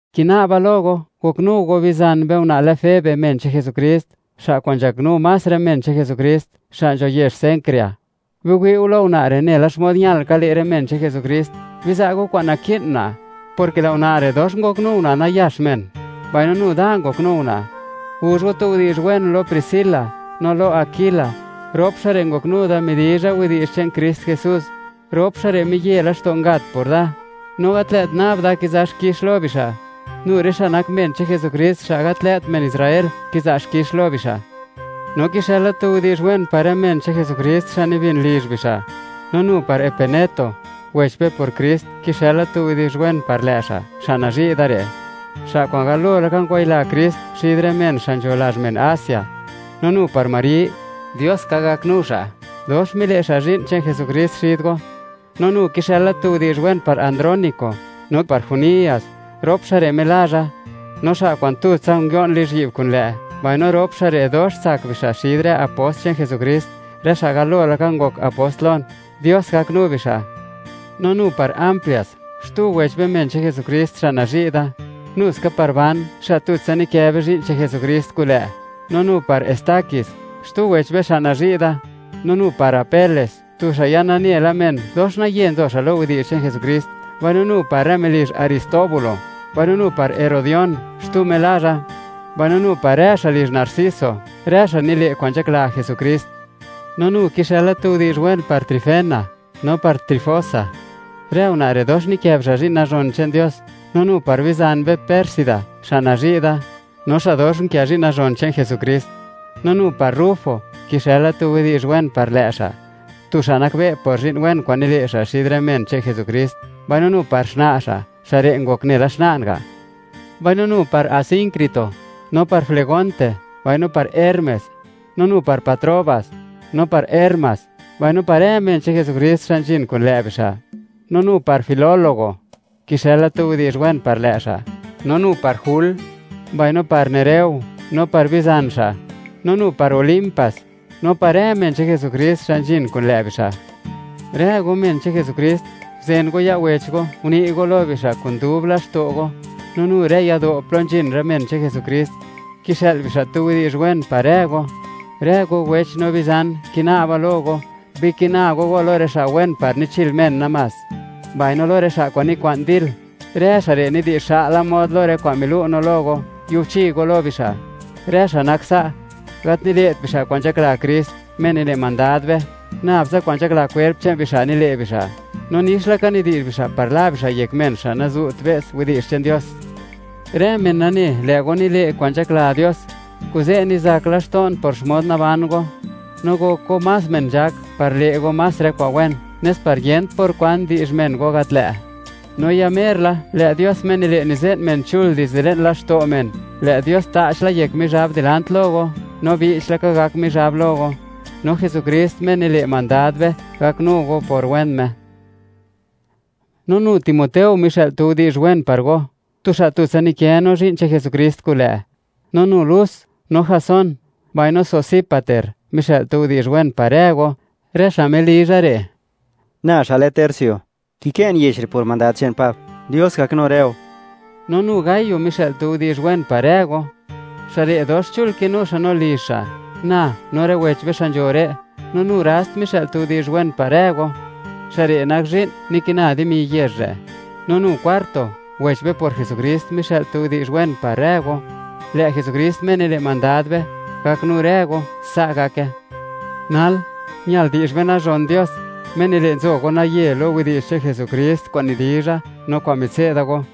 Kina'ba lo go, goknu go bizan be una' lë Febe men che'n Jesukrist, xa' kwa'n nzhaknu más rë men che'n Jesukrist xa' nzho yezh Cencrea. Biwi'u lo una' re' nela xmod ñal ka le' rë men che'n Jesukrist. Biza' go kwan naki'n una', porke lë' una' re', dox ngoknu una' nayax men, mbaino nu da ngoknu una'. Guzh go tu widi'zh wen lo Priscila no lo Aquila; rop xa' re' ngoknu da midizha widi'zh che'n Krist Jesús. Rop xa' re' miye laxto' ngat por da. No gat lë't nab da kiza' xkix lo bixa', nu rë xa' nak men che'n Jesukrist, xa' gat lë't men Israel kiza' xkix lo bixa'. No kixëla tu widi'zh wen par rë men che'n Jesukrist xa' nibin lizh bixa'. No nu par Epeneto, wech be por Krist, kixëla tu widi'zh wen par lë' xa', xa' nazhi' da re', xa' kwa'n galo laka ngwayila Krist xid rë men xa' nzho lazh men Asia. No nu par Mari, Dios ka gaknu xa'; dox mile' xa' zhi'n che'n Jesukrist xid go. No nu kixëla tu widi'zh wen par Andrónico, no par Junias, rop xa' re' melazha, no xa' kwa'n tutsa nguio'n lizhyi'b kulë', mbaino rop xa' re' dox tsak bixa' xid rë apost che'n Jesukrist, rë xa' galo laka ngok apost lon; Dios gaknu bixa'. No nu par Amplias, xtu wech be men che'n Jesukrist xa' nazhi' da. Nuska par Ban, xa' tutsa nikë be zhi'n che'n Jesukrist kulë', no nu par Estaquis, xtu wech be xa' nazhi' da. No nu par Apeles, tu xa' ya nane la men, dox naye nzo xa' lo widi'zh che'n Jesukrist; mbaino nu par rë melizh Aristóbulo. Mbaino nu par Herodión, xtu melazha, mbaino nu par rë xa' lizh Narciso, rë xa' nile' kwa'n nzhakla Jesukrist. No nu kixëla tu widi'zh wen par Trifena no par Trifosa. Rë una' re' dox nikë bixa' zhi'n nazhon che'n Dios. No nu par bizan be Pérsida, xa' nazhi' da, no xa' dox unkë zhi'n nazhon che'n Jesukrist. No nu par Rufo, kixëla tu widi'zh wen par lë' xa', tu xa' nakbe' por zhi'n wen kwa'n nile' xa' xid rë men che'n Jesukrist, mbaino nu par xna' xa', xa' re' ngok nela xna'n ga'. Mbaino nu par Asíncrito, no par Flegonte mbaino par Hermes, no nu par Patrobas, no par Hermas, mbaino par rë men che'n Jesukrist xa' nzhin kun lë' bixa'. No nu par Filólogo, kixëla tu widi'zh wen par lë' xa', no nu par Jul, mbaino par Nereo no par bizan xa', no nu par Olimpas, no par rë men che'n Jesukrist xa' nzhin kun lë' bixa'. Rë go, men che'n Jesukrist, guzen go ya' wech go, uni' go lo bixa' kun dub laxto' go. No nu rë yado' plo nzhin rë men che'n Jesukrist, kixë'l bixa' tu widi'zh wen par rë go. Rë go wech no bizan, kina'ba lo go, bikina go go lo rë xa' wen par nichil men namás, mbaino lo rë xa' kwa'n nikwa'n dil. Rë xa' re' nidi'zh xa'la mod lo rë kwa'n milu' no lo go; yubchi go lo bixa'. Rë xa' nak sa', gat nile't bixa' kwa'n nzhakla Krist, Me nile' mandad be; nab tsa kwa'n nzhakla kwerp che'n bixa' nile' bixa'; no nix laka nidi'zh bixa' par la bixa' yek men xa' nazu't be's widi'zh che'n Dios. Rë men nane, lë' go nile' kwa'n nzhakla Dios, kuze' nizak laxto'n por xmod naban go; no gok go más men nzhak par le' go más rë kwa'n wen, nes par yent por kwan di'zh men go gat lë', no ya mer la, lë' Dios Me nile' nize'n men chul dizde le'n laxto' men, lë' Dios ta'ch la yek Mizhab dilant lo go, no che'ptsa (bi'ch laka) gak Mizhab lo go. No Jesukrist, Me nile' mandad be, gaknu go por wen Me. No nu Timoteo mixë'l tu widi'zh wen par go, tu xa' tutsa nikë no zhi'n che'n Jesukrist kun lë'; no nu Lus no Jasón, mbaino Sosípater mixë'l tu widi'zh wen par rë go; rë xa' melizha re'. Na xa' lë Tercio, kikë'n yech re' por mandad che'n Pab, Dios gaknu rë go. No nu Gayo mixë'l tu widi'zh wen par rë go. Xa' re' dox chul kinu xa' no lizh xa', na no rë wech be xa' nzho re'. No nu Rast mixë'l tu widi'zh wen par rë go, xa' re' nak zhi'n, nikina dimi yezh re'. No nu Cuarto, wech be por Jesukrist, mixë'l tu widi'zh wen par rë go. Lë' Jesukrist, Me nile' mandad be, gaknu rë go. Sa' gake. Nal, ñal di'zh be nazhon Dios, Me nile' nzo go naye lo widi'zh che'n Jesukrist kwa'n nidizha no kwa'n mitse'da go,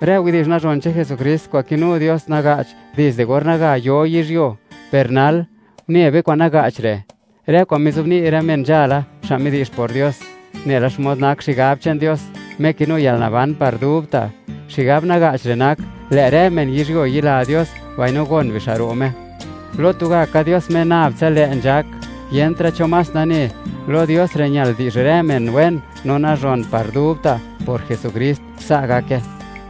rë widi'zh nazhon che'n Jesukrist kwa'n kinu Dios naga'ch dizde or naga yo yizhyuo. Per nal une be kwa'n naga'ch re', rë kwa'n mizobni' rë men nzhala, xa' midi'zh por Dios; nela xmod nak xigab che'n Dios, Me kinu yalnaban par dubta'. Xigab naga'ch re' nak: lë' rë men yizhyuo yila Dios mbaino gon bixa' ro' Me. Lo tugaka Dios Me nab tsa lë' nzhak, yentra' cho más nane; lo Dios re' ñal di'zh rë men wen no nazhon par dubta' por Jesukrist. Sa' gake.